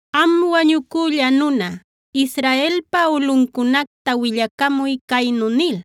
“Am wañucülla nuna, Israelpa ulꞌuncunacta willacamuy caynu nil: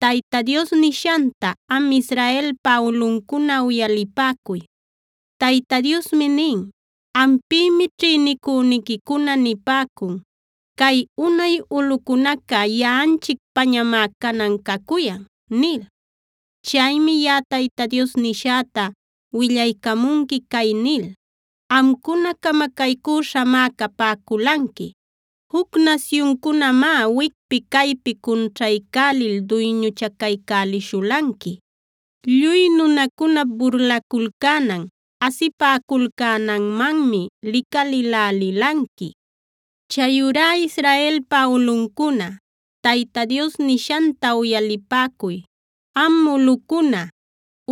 ‘Tayta Dios nishanta am Israelpa ulꞌuncuna uyalipäcuy. Tayta Diosmi nin: Ampïmi ćhïnicüniquicuna nipäcun: “Cay unay ulꞌucunaca yaꞌanchicpañamá canan cacuyan” nil. Chaymi yaꞌa Tayta Dios nishäta willaycamunqui cay nil: Amcuna camacaycüśhamá capäculanqui; juc nasyuncunamá wicpi caypi cunćhaycälil duyñuchacaycälishulanqui. Lluy nunacunap burlaculcänan, asipäculcänanmanmi licalïlälilanqui. Chayurá Israelpa ulꞌuncuna, Tayta Dios nishanta uyalipäcuy. Am ulꞌucuna,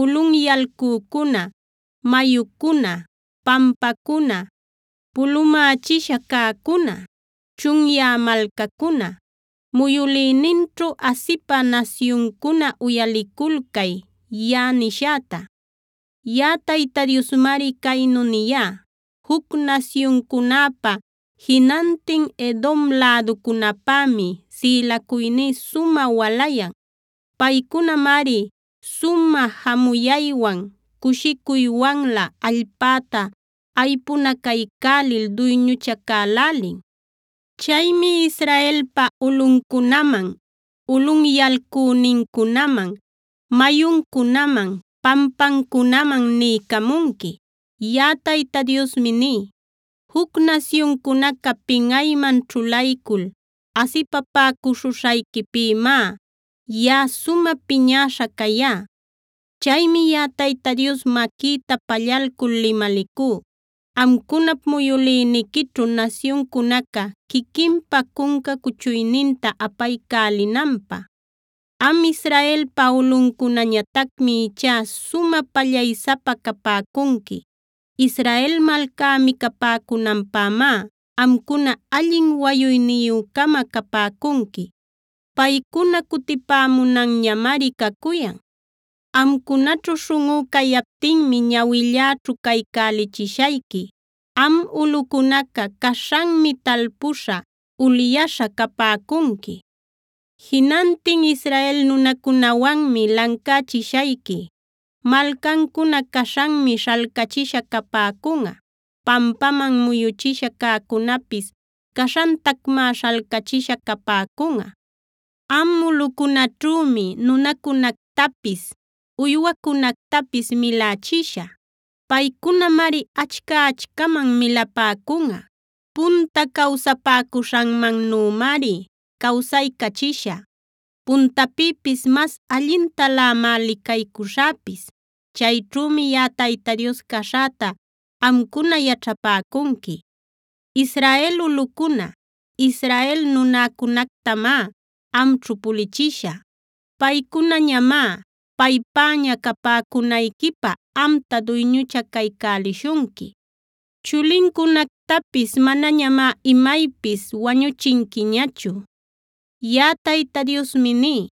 ulꞌunyalcücuna, mayucuna, pampacuna, pulumächisha cäcuna, chunyä malcacuna, muyülïninćhu asipä nasyuncuna uyaliculcay yaꞌa nishäta. Yaꞌa Tayta Diosmari caynu niyá: Juc nasyuncunäpa, jinantin Edom läducunäpämi sïlacuyní sumä walayan. Paycunamari sumä jamuyaywan, cushicuywanlä allpäta aypunacaycälil duyñuchacälälin. Chaymi Israelpa ulꞌuncunaman, ulꞌunyalcünincunaman, mayuncunaman, pampancunaman niycamunqui. Yaꞌa Tayta Diosmi ní: juc nasyuncunaca pinꞌayman ćhulaycul asipapäcuśhuśhayquipïmá yaꞌa sumä piñäśha cayá. Chaymi yaꞌa Tayta Dios maquïta pallalcul limalicú, amcunap muyülïniquićhu nasyuncunaca quiquinpa cunca cuchuyninta apaycälinanpä. “ ‘Am Israelpa ulꞌuncunañatacmi ichá sumä pallaysapa capäcunqui. Israel malcá micapäcunanpämá amcuna allin wayuyniyü-cama capäcunqui. Paycuna cutipämunanñamari cacuyan. Amcunaćhu śhunꞌú cayaptinmi ñawilläćhu caycälichishayqui. Am ulꞌucunaca caśhanmi talpuśha, ulyaśha capäcunqui. Jinantin Israel nunacunäwanmi lancächishayqui. Malcancuna caśhanmi śhalcachisha capäcunꞌa. Pampaman muyuchisha cäcunäpis caśhantacmá śhalcachisha capäcunꞌa. Am ulꞌucunäćhümi nunacunactapis, uywacunactapis milächishä. Paycunamari achca-achcaman milapäcunꞌa. Punta cawsapäcuśhanmannümari cawsaycachishä. Puntapïpis mas allintalämá licaycuśhäpis. Chayćhümi yaꞌa Tayta Dios caśhäta amcuna yaćhapäcunqui. Israel ulꞌucuna, Israel nunäcunactamá amćhu pulichishä. Paycunañamá, paypäña capäcunayquipä amta duyñuchacaycälishunqui. Chulincunactapis manañamá imaypis wañuchinquiñachu. “ ‘Yaꞌa Tayta Diosmi ní: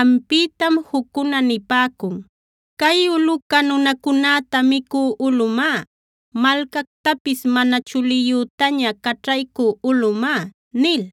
Ampïtam juccuna nipäcun: “Cay ulꞌuca nunacunäta micü ulꞌumá; malcactapis mana chuliyütaña caćhaycü ulꞌumá” nil.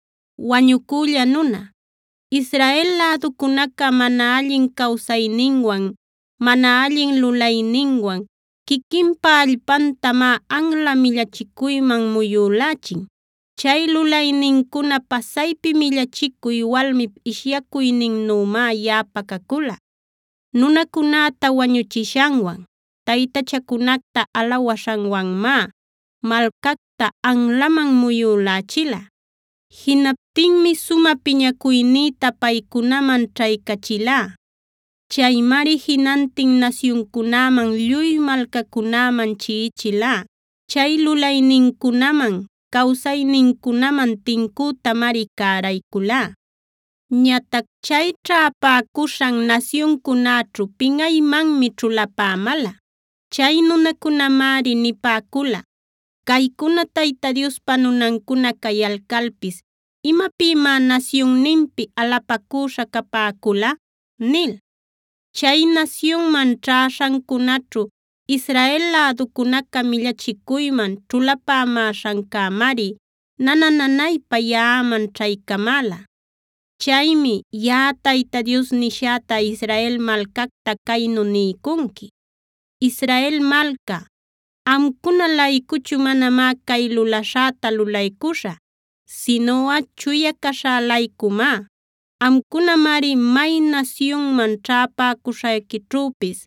“Wañucülla nuna, Israel läducunaca mana allin cawsayninwan, mana allin lulayninwan quiquinpa allpantamá anla millachicuyman muyülächin. Chay lulaynincuna pasaypi millachicuy, walmip ishyacuyninnümá yaꞌapä cacula. Nunacunäta wañuchishanwan, taytachacunacta alawaśhanwanmá malcacta anlaman muyülächila. Jinaptinmi sumä piñacuynïta paycunaman ćhaycachilá. Chaymari jinantin nasyuncunäman, lluy malcacunäman chiꞌichilá. Chay lulaynincunaman, cawsaynincunaman tincütamari cärayculá. Ñatac chay ćhäpäcuśhan nasyuncunäćhu pinꞌaymanmi ćhulapämäla. Chay nunacunämari nipäcula: ‘Caycuna Tayta Diospa nunancuna cayalcalpis ¿imapïmá nasyunninpi alapacüśha capäcula?’ nil. Chay nasyunman ćhäśhancunaćhu Israel läducunaca millachicuyman ćhulapämäśhancämari nana-nanaypa yaꞌaman ćhaycamäla. “Chaymi yaꞌa Tayta Dios nishäta Israel malcacta caynu niycunqui: Israel malca, amcuna-laycuchu manamá cay lulaśhäta lulaycuśhä, sinuꞌa chuya caśhä-laycumá. Amcunamari may nasyunman ćhäpäcuśhayquićhüpis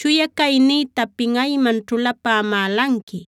chuya caynïta pinꞌayman ćhulapämälanqui.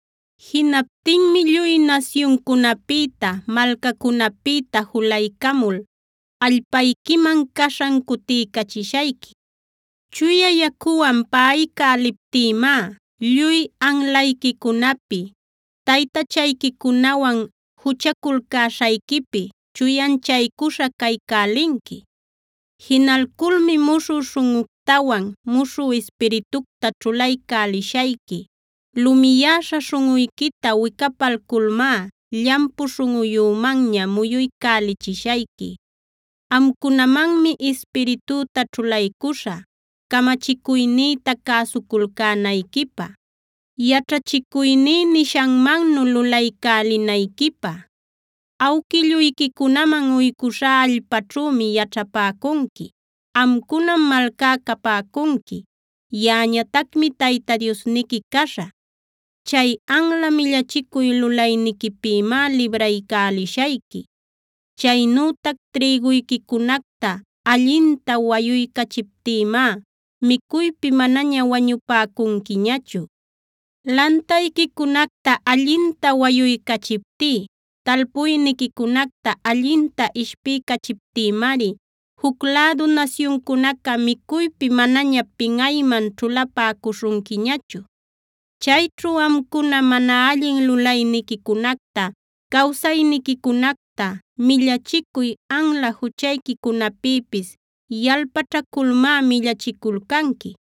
“Jinaptinmi lluy nasyuncunäpïta, malcacunäpïta julaycamul allpayquiman caśhan cutiycachishayqui. Chuya yacuwan paꞌaycäliptïmá lluy anlayquicunapi, taytachayquicunawan juchaculcäśhayquipi chuyanchaycuśha caycälinqui. Jinalculmi muśhü śhunꞌuctawan muśhü ispiritucta ćhulaycälishayqui. Lumiyäśha śhunꞌuyquita wicapalculmá llampu śhunꞌuyümanña muyuycälichishayqui. Amcunamanmi ispiritüta ćhulaycuśhä, camachicuynïta cäsuculcänayquipä, yaćhachicuyní nishanmannu lulaycälinayquipä. Awquilluyquicunaman uycuśhá allpaćhümi yaćhapäcunqui. Amcunam malcá capäcunqui; yaꞌañatacmi Tayta Diosniqui caśhä. Chay anla millachicuy lulayniquipïmá libraycälishayqui. Chaynütac trïguyquicunacta allinta wayuycachiptïmá micuypi manaña wañupäcunquiñachu. Lantayquicunacta allinta wayuycachiptí, talpuyniquicunacta allinta ishpiycachiptïmari juc lädu nasyuncunaca micuypi manaña pinꞌayman ćhulapäcuśhunquiñachu. Chayćhu amcuna mana allin lulayniquicunacta, cawsayniquicunacta, millachicuy, anla juchayquicunapïpis yalpaćhaculmá millachiculcanqui.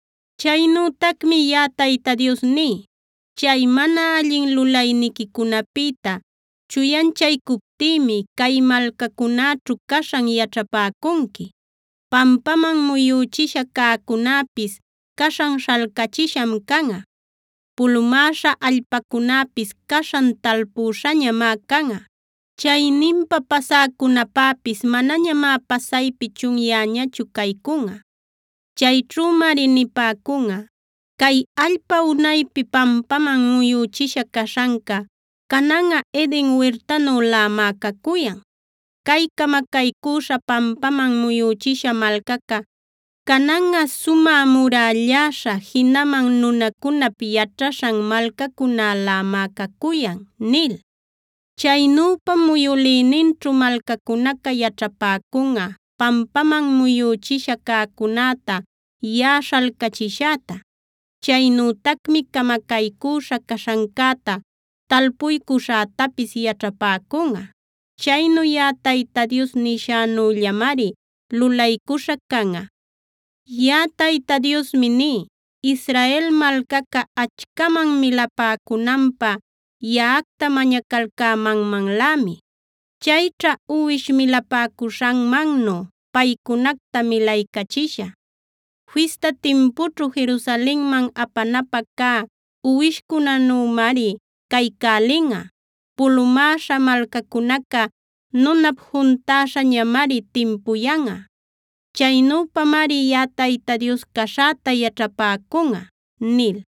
“Chaynütacmi yaꞌa Tayta Dios ní: Chay mana allin lulayniquicunapïta chuyanchaycuptïmi cay malcacunäćhu caśhan yaćhapäcunqui; pampaman muyüchisha cäcunäpis caśhan śhalcachisham canꞌa. Pulumäśha allpacunäpis caśhan talpuśhañamá canꞌa. Chayninpa pasäcunäpäpis manañamá pasaypi chunyäñachu caycunꞌa. Chayćhümari nipäcunꞌa: ‘Cay allpa unaypi pampaman muyüchisha caśhanca, cananꞌa Eden wirtanülämá cacuyan. Cay camacaycüśha, pampaman muyüchisha malcaca, cananꞌa sumä murälläśha, jinaman nunacunap yaćhaśhan malcacunalämá cacuyan’ nil. Chaynüpam muyülïninćhu malcacunaca yaćhapäcunꞌa pampaman muyüchisha cäcunäta yaꞌa śhalcachishäta. Chaynütacmi camacaycüśha caśhancäta talpuycuśhätapis yaćhapäcunꞌa. Chaynu yaꞌa Tayta Dios nishänüllamari lulaycuśha canꞌa. “Yaꞌa Tayta Diosmi ní: Israel malcaca achcaman milapäcunanpä yaꞌacta mañacalcämanmanlämi. Chayćha uwish milapäcuśhanmannu paycunacta milaycachishä. Fista timpućhu Jerusalenman apanapä cä uwishcunänümari caycälinꞌa. Pulumäśha malcacunaca nunap juntäśhañamari timpuyanꞌa. Chaynüpamari yaꞌa Tayta Dios caśhäta yaćhapäcunꞌa” nil.